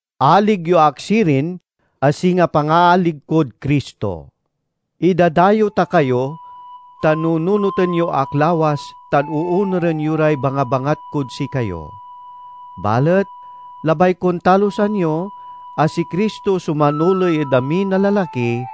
Alig yo ak sirin, a singa pangaalig kod Cristo. Idadayew ta kayo, ta nununoten yo ak lawas tan oonuren yo ray bangabangat kod sikayo. Balet labay kon talusan yo a si Cristo so manoley ed amin a lalaki,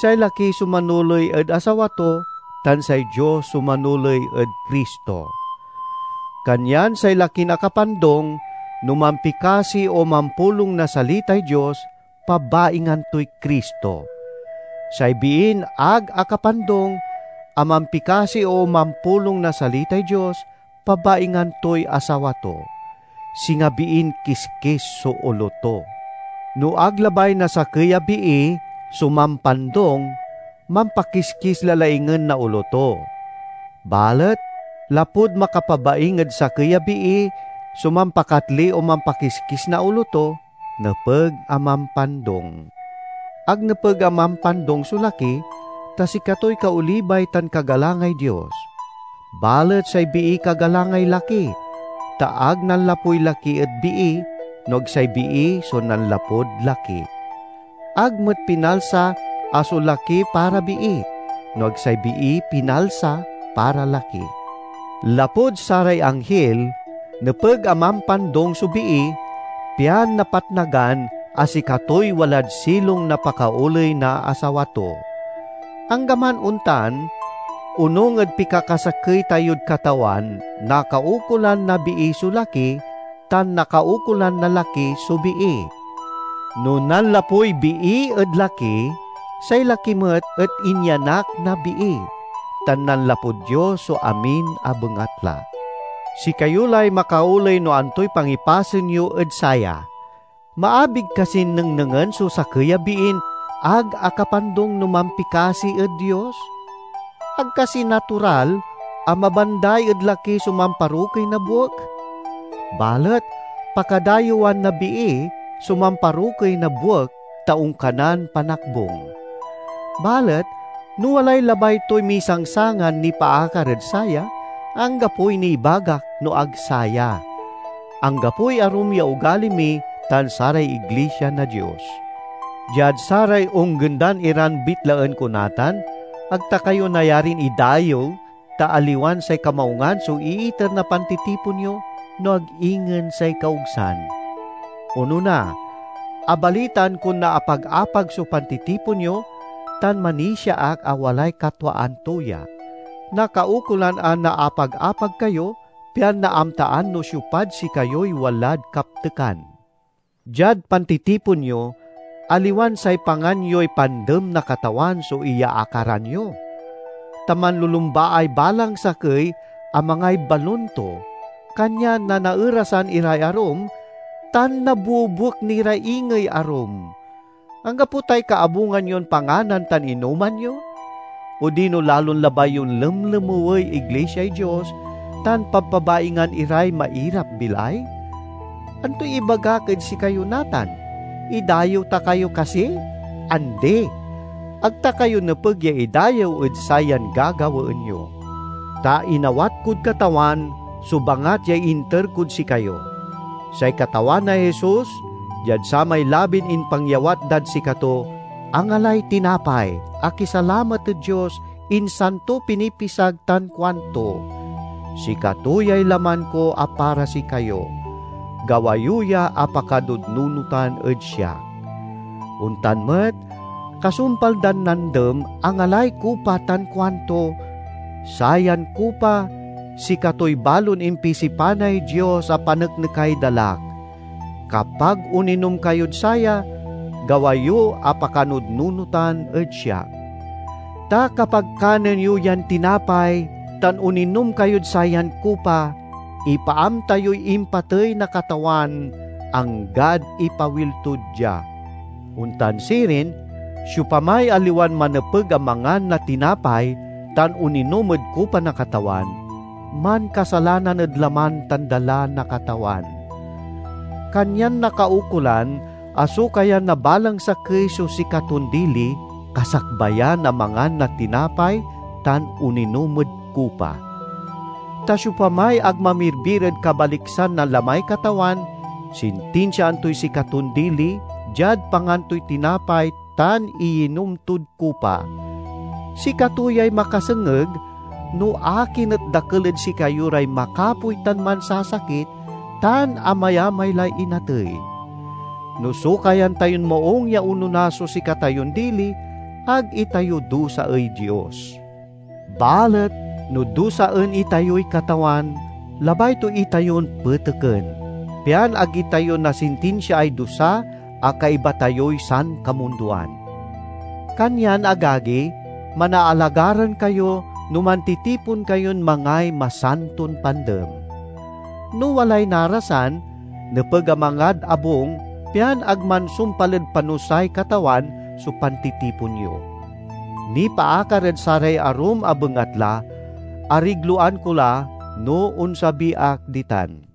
say laki so manoley ed asawa to, tan say Dios so manoley ed Cristo. Kanyan say lakin akapandung no mampikasi o mampulong na salitay Dios, pabaingan toy Cristo. Say biin ag akapandung a mampikasi o mampulong na salitay Dios, pabaingan toy asawa to; singa biin kiskis so olo to. No ag labay na sakey a bii so mampandung, mampakiskis la laingen na olo to. Balet lapud makapabaing ed sakey a bii so mampakatli o mampakiskis na olo to, nepeg a mampandung. Ag nepeg a mampandung so laki, ta sikatoy kaolibay tan kagalangay Dios. Balet say bii kagalangay laki, ta ag nanlapuy laki ed bii, no ag say bii so nanlapud laki. Ag met pinalsa a so laki para bii, no ag say bii pinalsa para laki. Lapud saray anghil, nepeg a mampandung so bii, pian napatnagan a sikatoy walad silong na pakaoley na asawa to. Anggaman ontan, onung ed pikakasakey tayod Katawan nakaukolan na bii so laki, tan nakaukolan na laki so bii. No nanlapuy bii ed laki, say laki met et inyanak na bii; tan nanlapud Dios so amin a bengatla. Sikayo lay makaoley no antoy pangipasen yo ed saya: maabig kasin nengnengen so sakey a biin ag akapandung no mampikasi ed Dios? Ag kasi natural a mabanday ed laki so mamparokey na buek? Balet pakadayewan na bii so mamparokey na buek, ta onkanan panakbung. Balet no walay labay toy misangsangan nipaakar ed saya, anggapoy nibagak no ag saya: anggapoy arum ya ogali mi tan saray iglisia na Dios. Diad saray onggendan iran bitlaen ko natan, ag ta kayo nayarin idayew ta aliwan say kamaungan so iiter na pantitipon yo, no ag ingen say kaogsan. Onona, abalitaan kon naapag-apag so pantitipon yo, tan manisia ak a walay katwaan to ya. (Nakaukolan a naapag-apag kayo, pian naamtaan no siopad sikayoy walad kaptekan.) Diad pantitipon yo, aliwan say pangan yoy Pandem na Katawan so iyaakaran yo. Ta manlulumbaay balang sakey a mangay balun to, kanyan nanaerasan iray arum tan nabuebuek ni ra ingey arum. Anggapo tay kaabungan yon panganan tan inoman yo? Odino lalon labay yon lemlemewey iglisiay Dios tan pabpabaingan iray mairap-bilay? Antoy ibagak ed sikayo natan? Idayew ta kayo kasi? Andi! Ag ta kayo nepeg ya idayew ed sayan gagawaen yo! Ta inawat kod Katawan so bangat ya inter kod sikayo: say Katawan a Jesus, diad samay labin impangyawat dad sikato, angalay tinapay, akisalamat ed Dios, insan to pinipisag tan kuanto, "Sikato yay laman ko a para sikayo; gawa yo ya a pakanudnunotan ed siak." Ontan met kasumpal dan nandem, angalay kupa tan kuanto, "Sayan kupa sikatoy balon impisipanay Dios a paneknekay dalak. Kapag oninom kayod saya, gawa yo a pakanudnunotan ed siak." Ta kapag kanen yo yan tinapay tan oninom kayod sayan kupa, ipaamta yoy impatey na Katawan anggad ipawil to dia. Ontan sirin, siopamay aliwan manepeg a mangan na tinapay tan oninom ed kupa na Katawan, mankasalanan ed laman tan dala na Katawan. Kanyan nakaukolan a sokayan na balang sakey so sikaton dili, kasakbayan a mangan na tinapay tan oninom ed kupa. Ta siopamay ag mamirbir ed kabaliksan na lamay Katawan, sintinsiaan toy sikaton dili diad pangan toy tinapay tan iyinom tod kupa. Sikato yay makasengeg no akin et dakel ed sikayo ray makapoy tan mansasakit, tan amayamay lay inatey. No sokayan tayon maung ya onona so sikatayon dili, ag itayo dusaey Dios. Balet no dusaen itayoy Katawan, labay to itayon peteken, pian ag itayo nasintinsiaay dusa a kaiba tayoy sankamundoan. Kanyan, agagi, manaalagaran kayo no mantitipon kayon mangay Masanton Pandem. No walay narasan, nepeg a mangad abung, pian ag mansumpal ed panusay Katawan so pantitipon yo. Nipaakar ed saray arum a bengatla, arigloan ko la no onsabi ak ditan.